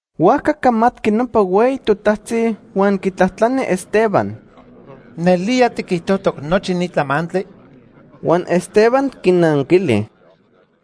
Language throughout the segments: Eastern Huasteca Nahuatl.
Huajca camatqui nopa hueyi totajtzi huan quitlajtlani Esteban: ―¿Nelía tiquijtojtoc nochi ni tlamantli? Huan Esteban quinanquili: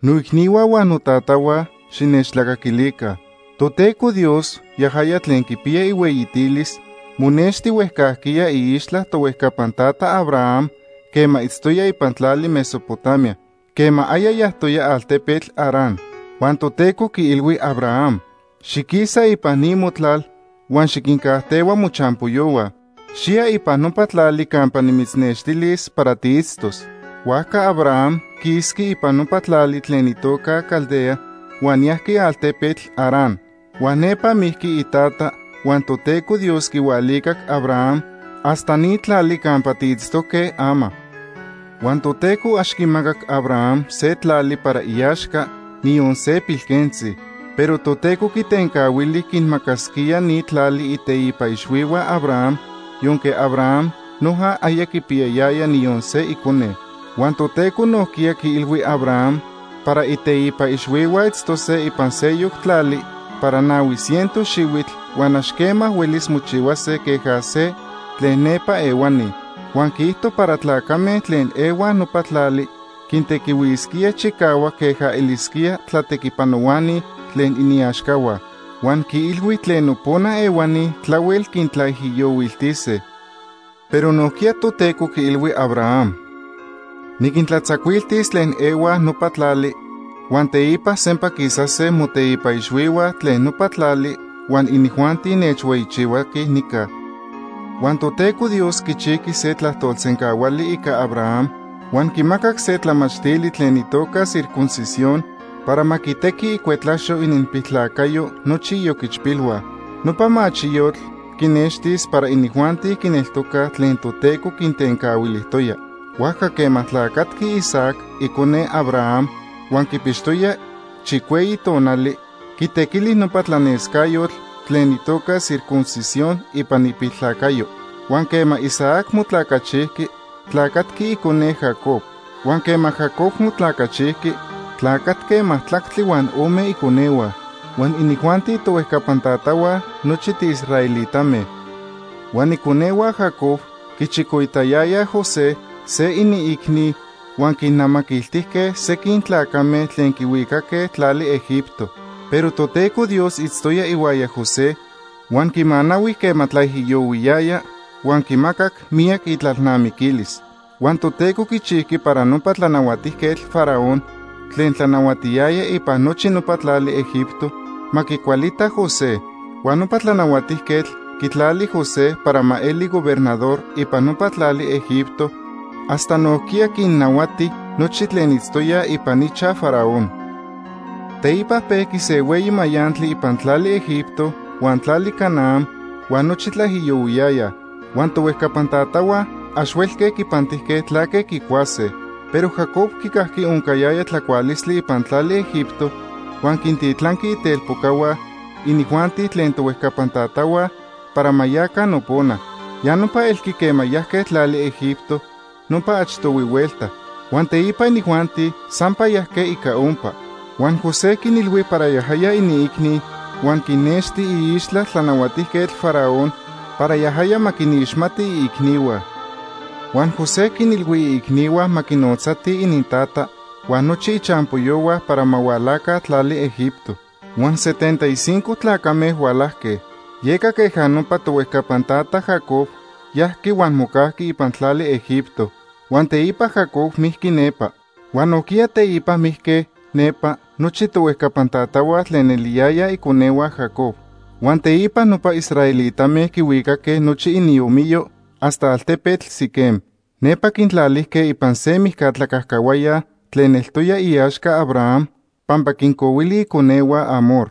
“Noicnihua huan notatahua, xinechtlacaquilica. Toteco Dios, yajaya tlen quipiya ihueyitilis, monexti huejcajquiya iixtla tohuejcapan tata Abraham quema itztoya ipan tlali Mesopotamia, quema aya yajtoya altepetl Harán. Huan Toteco quiilhui Abraham: ‘Xiquisa ipan ni motlal huan xiquincajtehua mochampoyohua. Xiya ipan nopa tlali campa nimitznextilis para tiitztos.’ “Huajca Abraham quisqui ipan nopa tlali tlen itoca Caldea, huan yajqui altepetl Harán. Huan nepa mijqui itata, huan Toteco Dios quihualicac Abraham hasta ni tlali campa tiitztoque ama. Huan Toteco ax quimacac Abraham se tlali para iaxca, niyon se pilquentzi. Pero Toteco quitencahuili quinmacasquía ni tlali iteipa ixhuihua Abraham yonque Abraham noja aya quipiyayaya niyon se icone. Huan Toteco nojquiya quiilhui Abraham para iteipa ixhuihua itztose ipan sejyoc tlali para nahui ciento xihuitl huan ax quema huelis mochihuase queja se tlen nepa ehuani. Huan quiijto para tlacame tlen ehuaj nopa tlali quintequihuisquíaj chicahuac queja elisquía tlatequipanohuani tlen iniaxcahua. Huan quiilhui tlen nopona ehuani tlahuel quintlaijiyohuiltise. Pero nojquiya Toteco quiilhui Abraham: ‘Niquintlatzacuiltis tlen ehuaj nopa tlali, huan teipa sampa quisase moteipa ixhuihua tlen nopa tlali huan inijuanti nechhueyichihuaquij nica.’ “Huan Toteco Dios quichijqui se tlajtolsencahuali ica Abraham huan quimacac se tlamachtili tlen itoca circuncisión para ma quitequi icuetlaxo ininpiltlacayo nochi ioquichpilhua. Nopa machiyotl quinextis para inijuanti quineltocaj tlen Toteco quintencahuilijtoya. Huajca quema tlacatqui Isaac, icone Abraham, huan quipixtoya chicueyi tonali, quitequili nopa tlanescayotl tlen itoca circuncisión ipan ipiltlacayo. Huan quema Isaac motlacachijqui, tlacatqui icone, Jacob. Huan quema Jacob motlacachijqui, tlacatque majtlactli huan ome iconehua. Huan inijuanti tohuejcapan tatahua nochi tiisraelitame. “Huan iconehua Jacob quichicoitayayaj José, se iniicni, huan quinnamaquiltijque sequin tlacame tlen quihuicaque tlali Egipto. Pero Toteco Dios itztoya ihuaya José, huan quimanahui quema tlaijiyohuiyaya huan quimacac miyac itlalnamiquilis. Huan Toteco quichijqui para nopa Tlanahuatijquetl Faraón, tlen tlanahuatiyaya ipan nochi nopa tlali Egipto, ma quicualita José. Huan nopa tlanahuatijquetl quitlali José para ma eli gobernador ipan nopa tlali Egipto hasta nojquiya quinnahuati nochi tlen itztoyaj ipan ichaj Faraón. “Teipa pejqui se hueyi mayantli ipan tlali Egipto huan tlali Canaán, huan nochi tlaijiyohuiyayaj. Huan tohuejcapan tatahua ax huelque quipantijque tlaque quicuase. Pero Jacob quicajqui oncayaya tlacualistli ipan tlali Egipto, huan quintitlanqui itelpocahua, inijuanti tlen tohuejcapan tatahua, para ma yaca nopona. Ya nopa elqui quema yajque tlali Egipto nopa achtohui huelta. Huan teipa inijuanti sampa yajque ica ompa. Huan José quinilhui para yajaya iniicni huan quinnexti iixtla Tlanahuatijquetl Faraón para yajaya ma quinixmati iicnihua. Huan José quinilhui iicnihua ma quinotzatij inintata huan nochi ichampoyohua para ma hualaca tlali Egipto. Huan setenta y cinco tlacame hualajque. Yeca queja nopa tohuejcapan tata Jacob yajqui huan mocajqui ipan tlali Egipto. Huan teipa Jacob mijqui nepa. Huan nojquiya teipa mijque nepa nochi tohuejcapan tatahua tlen eliyayaj iconehua Jacob. Huan teipa nopa israelitame quihuicaque nochi iniomiyo hasta altepetl Siquem. Nepa quintlalijque ipan se mijca tlacajcahuaya tlen eltoya iaxca Abraham pampa quincohuili iconehua Hamor.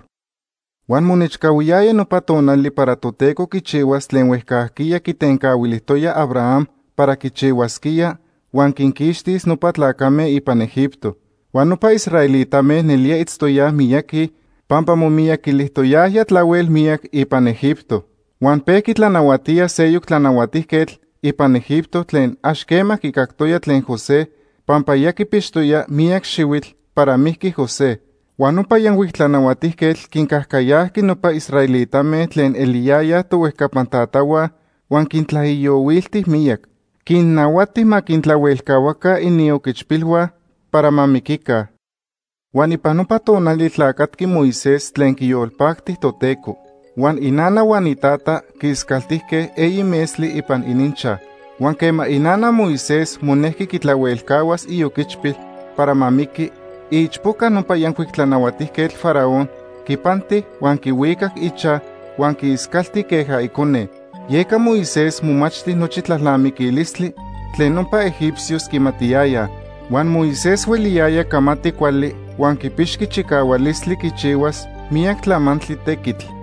“Huan monechcahuiyaya nopa tonali para Toteco quichihuas tlen huejcajquiya quitencahuilijtoya Abraham para quichihuasquía huan quinquixtis nopa tlacame ipan Egipto. Huan nopa israelitame nelía itztoyaj miyaqui pampa momiyaquilijtoyajya tlahuel miyac ipan Egipto. Huan pejqui tlanahuatía seyoc tlanahuatijquetl ipan Egipto tlen ax quema quicactoya tlen José pampa ya quipixtoya miyac xihuitl para mijqui José. Huan nopa yancuic tlanahuatijquetl quincajcayajqui nopa israelitame tlen eliyayaj tohuejcapan tatahua huan quintlaijiyohuilti miyac. Quinnahuati ma quintlahuelcahuaca ininpiloquichpilhua para ma miquica. “Huan ipan nopa tonali tlacatqui Moisés tlen quiyolpacti Toteco. Huan inana huan itata quiiscaltijque eyi metztli ipan ininchaj. Huan quema inana Moisés monejqui quitlahuelcahuas ioquichpil para ma miqui, iichpoca nopa yancuic tlanahuatijquetl Faraón quipanti huan quihuicac ichaj huan quiiscalti queja icone. Yeca Moisés momachti nochi tlalnamiquilistli tlen nopa egipcios quimatiyayaj. Huan Moisés hueliyaya camati cuali huan quipixqui chicahualistli quichihuas miyac tlamantli tequitl.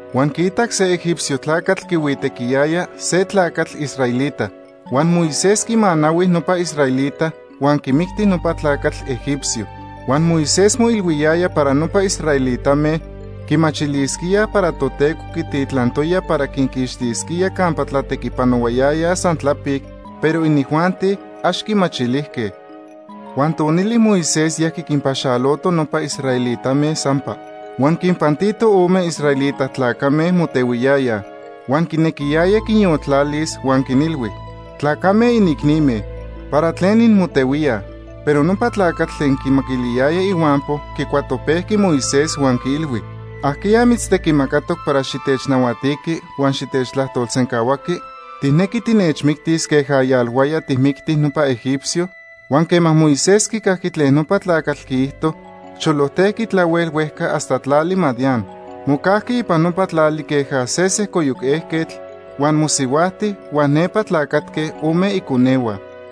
Huan quiitac se egipcio tlacatl quihuitequiyaya se tlacatl israelita. Huan Moisés quimanahui nopa israelita huan quimicti nopa tlacatl egipcio. Huan Moisés moilhuiyaya para nopa israelitame quimachilisquíaj para Toteco quititlantoya para quinquixtisquía campa tlatequipanohuayayaj san tlapic, pero inijuanti ax quimachilijque. Huan tonili Moisés yajqui quinpaxaloto nopa israelitame sampa. Huan quinpantito ome israelita tlacame motehuiyayaj. Huan quinequiyaya quinyoltlalis huan quinilhui: ‘Tlacame, inicnime, ¿para tlen inmotehuíaj?’ “Pero nopa tlacatl tlen quimaquiliyaya ihuampo quicuatopejqui Moisés huan quiilhui: ‘¿Ajqueya mitztequimacatoc para xitechnahuatiqui huan xitechtlajtolsencahuaqui? ¿Tijnequi tinechmictis queja yalhuaya tijmicti nopa egipcio?’ Huan quema Moisés quicajqui tlen nopa tlacatl quiijto, cholojtejqui tlahuel huejca hasta tlali Madián. Mocajqui ipan nopa tlali queja se sejcoyoc ejquetl, huan mosihuajti huan nepa tlacatque ome iconehua.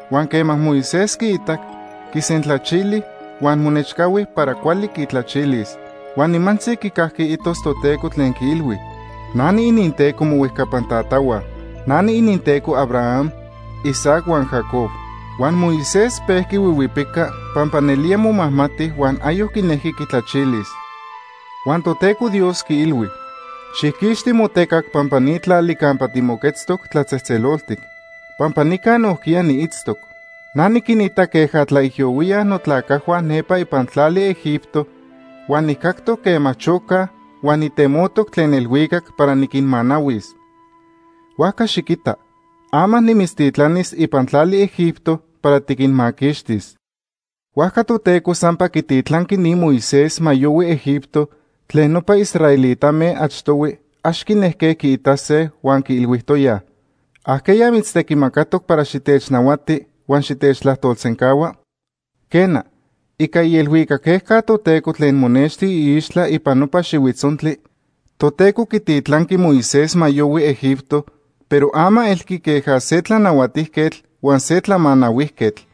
Huan quema Moisés quiitac, quisentlachili huan monechcahui para cuali quitlachilis. Huan nimantzi quicajqui itos Toteco tlen quiilhui: ‘Na niininTeco mohuejcapan tatahua. Na niininTeco Abraham, Isaac huan Jacob.’ Huan Moisés pejqui huihuipica pampa nelía momajmati huan ayoc quinejqui quitlachilis. Huan Toteco Dios quiilhui: ‘Xijquixti motecac pampa ni tlali campa timoquetztoc tlatzejtzeloltic, pampa nica nojquiya niitztoc. Na niquinita queja tlaijiyohuíaj notlacajhua nepa ipan tlali Egipto, huan nijcactoc quema chocaj huan nitemotoc tlen elhuicac para niquinmanahuis. Huajca xiquita, ama nimitztitlanis ipan tlali Egipto para tiquinmaquixtis.’ “Huajca Toteco sampa quititlanqui ni Moisés ma yohui Egipto tlen nopa israelitame achtohui ax quinejque quiitase huan quiilhuijtoyaj: ‘¿Ajqueya mitztequimacatoc para xitechnahuati huan xitechtlajtolsencahua?’ Quena, ica ielhuicac ejca Toteco tlen monexti iixtla ipan nopa xihuitzontli, Toteco quititlanqui Moisés ma yohui Egipto, pero ama elqui queja se tlanahuatijquetl huan se tlamanahuijquetl.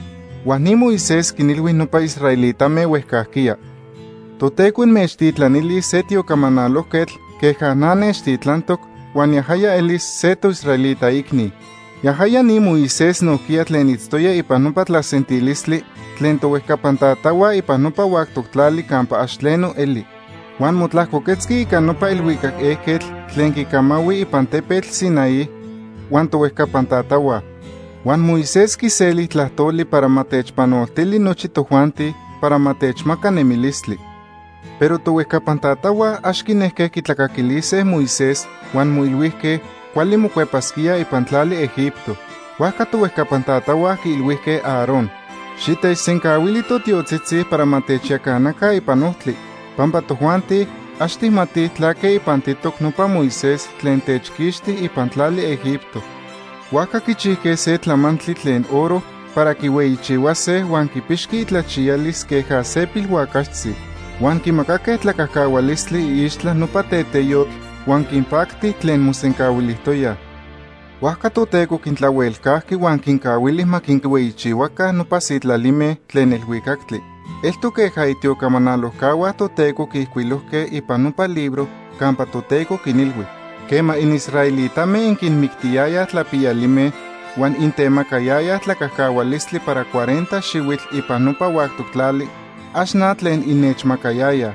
Huan ni Moisés quinilhui nopa israelitame huejcajquiya: ‘Toteco inmechtitlanilis se tiocamanalojquetl queja na nechtitlantoc huan yajaya elis se toisraelita icni.’ Yajaya ni Moisés nojquiya tlen itztoya ipan nopa tlasentilistli tlen tohuejcapan tatahua ipan nopa huactoc tlali campa ax tleno eli. Huan motlajcoquetzqui ica nopa elhuicac ejquetl tlen quicamahui ipan tepetl Sinaí huan tohuejcapan tatahua. Huan Moisés quiseli tlajtoli para ma techpanoltili nochi tojuanti para ma techmaca nemilistli. “Pero tohuejcapan tatahua ax quinejque quitlacaquilise Moisés huan moilhuijque cuali mocuepasquíaj ipan tlali Egipto. Huajca tohuejcapan tatahua quiilhuijque Aarón: ‘Xitechsencahuili totiotzitzi para ma techyacanaca ipan ojtli, pampa tojuanti ax tijmatij tlaque ipantitoc nopa Moisés tlen techquixti ipan tlali Egipto.’ Huajca quichijque se tlamantli tlen oro para quihueyichihuase huan quipixqui itlachiyalis queja se pilhuacaxtzi. Huan quimacaque tlacajcahualistli iixtla nopa teteyotl huan quinpacti tlen mosencahuilijtoyaj. Huajca Toteco quintlahuelcajqui huan quincahuili ma quinhueyichihuaca nopa sitlalime tlen elhuicactli. Eltoc queja itiocamanalojcahua Toteco quiijcuilojque ipan nopa libro campa Toteco quinilhui: ‘Quema inisraelitame inquinmictiyayaj tlapiyalime, huan intemacayayaj tlacajcahualistli para cuarenta xihuitl ipan nopa huactoc tlali, ax na tlen innechmacayayaj.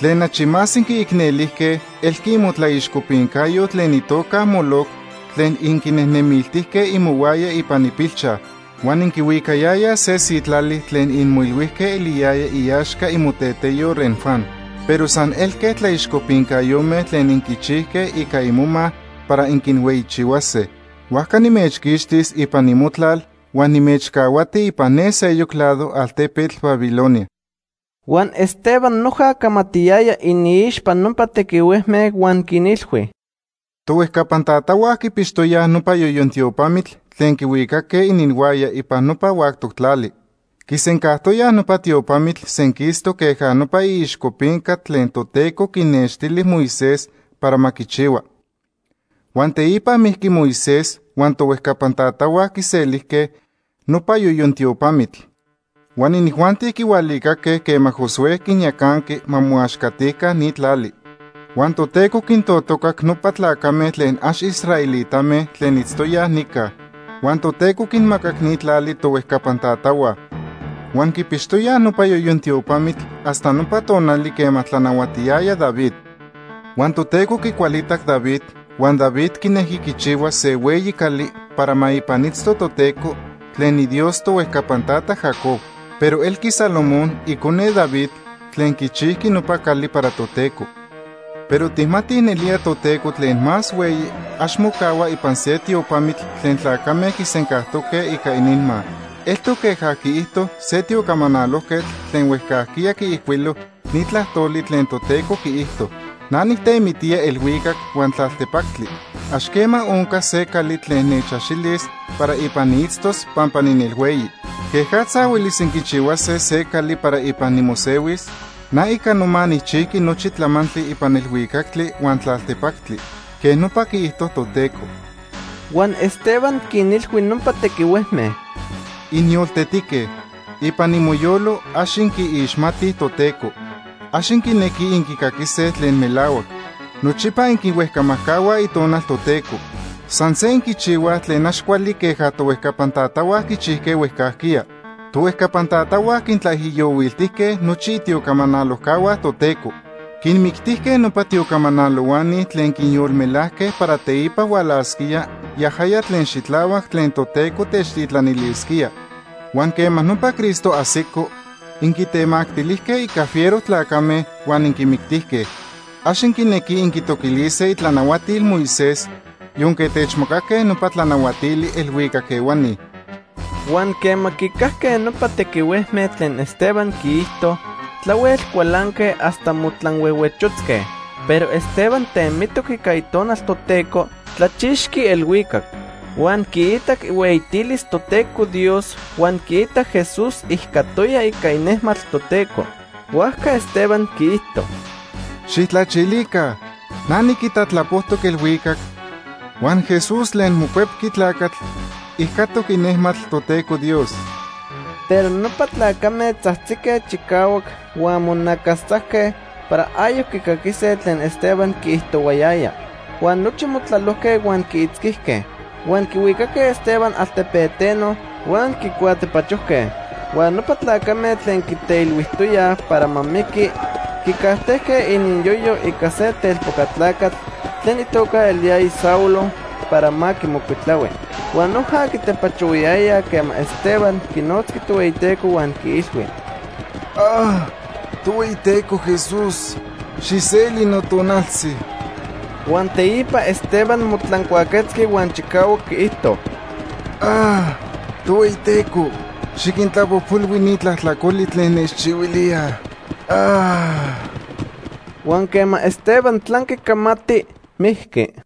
Tlen achi más inquiicnelijque elqui imotlaixcopincayo tlen itoca Moloc tlen inquinejnemiltijque imohuaya ipan ipilchaj. Huan inquihuicayayaj se sitlali tlen inmoilhuijque eliyaya iaxca imoteteyo Renfán. Pero san elque tlaixcopincayome tlen inquichijque ica imoma para inquinhueyichihuase. Huajca nimechquixtis ipan imotlal huan nimechcahuati ipan ne seyoc lado altepetl Babilonia.’” Huan Esteban noja camatiyaya iniixpa nopa tequihuejme huan quinilhui: “Tohuejcapan tatahua quipixtoyaj nopa yoyon tiopamitl tlen quihuicaque ininhuaya ipan nopa huactoc tlali. Quisencajtoyaj nopa tiopamitl senquistoc queja nopa iixcopinca tlen Toteco quinextili Moisés para ma quichihua. Huan teipa mijqui Moisés huan tohuejcapan tatahua quiselijque nopa yoyon tiopamitl. Huan inijuanti quihualicaque quema Josué quinyacanqui ma moaxcatica ni tlali. Huan Toteco quintotocac nopa tlacame tlen ax israelitame tlen itztoyaj nica. Huan Toteco quinmacac ni tlali tohuejcapan tatahua. Huan quipixtoyaj nopa yoyon tiopamitl hasta nopa tonali quema tlanahuatiyaya David. Huan Toteco quicualitac David, huan David quinejqui quichihuas se hueyi cali para ma ipan itzto Toteco, tlen iDios tohuejcapan tata Jacob. Pero elqui Salomón, icone David, tlen quichijqui nopa cali para Toteco. Pero tijmatij nelía Toteco Tlen Más Hueyi ax mocahua ipan se tiopamitl tlen tlacame quisencajtoque ica ininma. Eltoc queja quiijto se tiocamanalojquetl tlen huejcajquiya quiijcuilo ni tlajtoli tlen Toteco quiijto: ‘Na nijtemitía elhuicac huan tlaltepactli. Ax quema oncas se cali tlen nechaxilis para ipan niitztos pampa ninelhueyi. ¿Quejatza huelis inquichihuase se cali para ipan nimosehuis? Na ica noma nijchijqui nochi tlamantli ipan elhuicactli huan tlaltepactli.’ Quej nopa quiijto Toteco.” Huan Esteban quinilhui nopa tequihuejme: “¡Inyoltetique! Ipan imoyolo ax inquiixmatij Toteco. Ax inquinequij inquicaquise tlen melahuac. Nochipa inquihuejcamajcahuaj Itonal Toteco. San se inquichihuaj tlen ax cuali queja tohuejcapan tatahua quichijque huejcajquiya. Tohuejcapan tatahua quintlaijiyohuiltijque nochi itiocamanalojcahua Toteco. Quinmictijque nopa tiocamanalohuani tlen quinyolmelajque para teipa hualasquía Yajaya Tlen Xitlahuac tlen Toteco techtitlanilisquía. Huan quema nopa Cristo ajsico, inquitemactilijque ica fiero tlacame huan inquimictijque. Ax inquinequij inquitoquilise itlanahuatil Moisés yonque techmacaque nopa tlanahuatili elhuicac ehuani.” Huan quema quicajque nopa tequihuejme tlen Esteban quiijto, tlahuel cualanque hasta motlanhuehuechotzque. Pero Esteban temitoc ica Itonal Toteco, tlachixqui elhuicac. Huan quiitac ihueyitilis Toteco Dios huan quiitac Jesús ijcatoya ica inejmatl Toteco. Huajca Esteban quiijto: ―¡Xijtlachilica! Na niquita tlapojtoc elhuicac huan Jesús tlen Mocuepqui Tlacatl ijcatoc inejmatl Toteco Dios. Pero nopa tlacame tzajtzique chicahuac huan monacastzajque para ayoc quicaquise tlen Esteban quiijtohuayaya. Huan nochi motlalojque huan quiitzquijque. Huan quihuicaque Esteban altepeteno huan quicuatepachojque. Huan nopa tlacame tlen quiteilhuijtoyaj para ma miqui quicajtejque ininyoyo ica se telpoca tlacatl tlen itoca eliyaya Saulo para ma quimocuitlahui. Huan noja quitepachohuayayaj quema Esteban quinotzqui Tohueyiteco huan quiilhui: “Tohueyiteco Jesús, xijseli notonaltzi.” Huan teipa Esteban motlancuaquetzqui huan chicahuac quiijto: “Tohueyiteco, xiquintlapojpolhui ni tlajtlacoli tlen nechchihuilíaj.” Huan quema Esteban tlanqui camati, mijqui.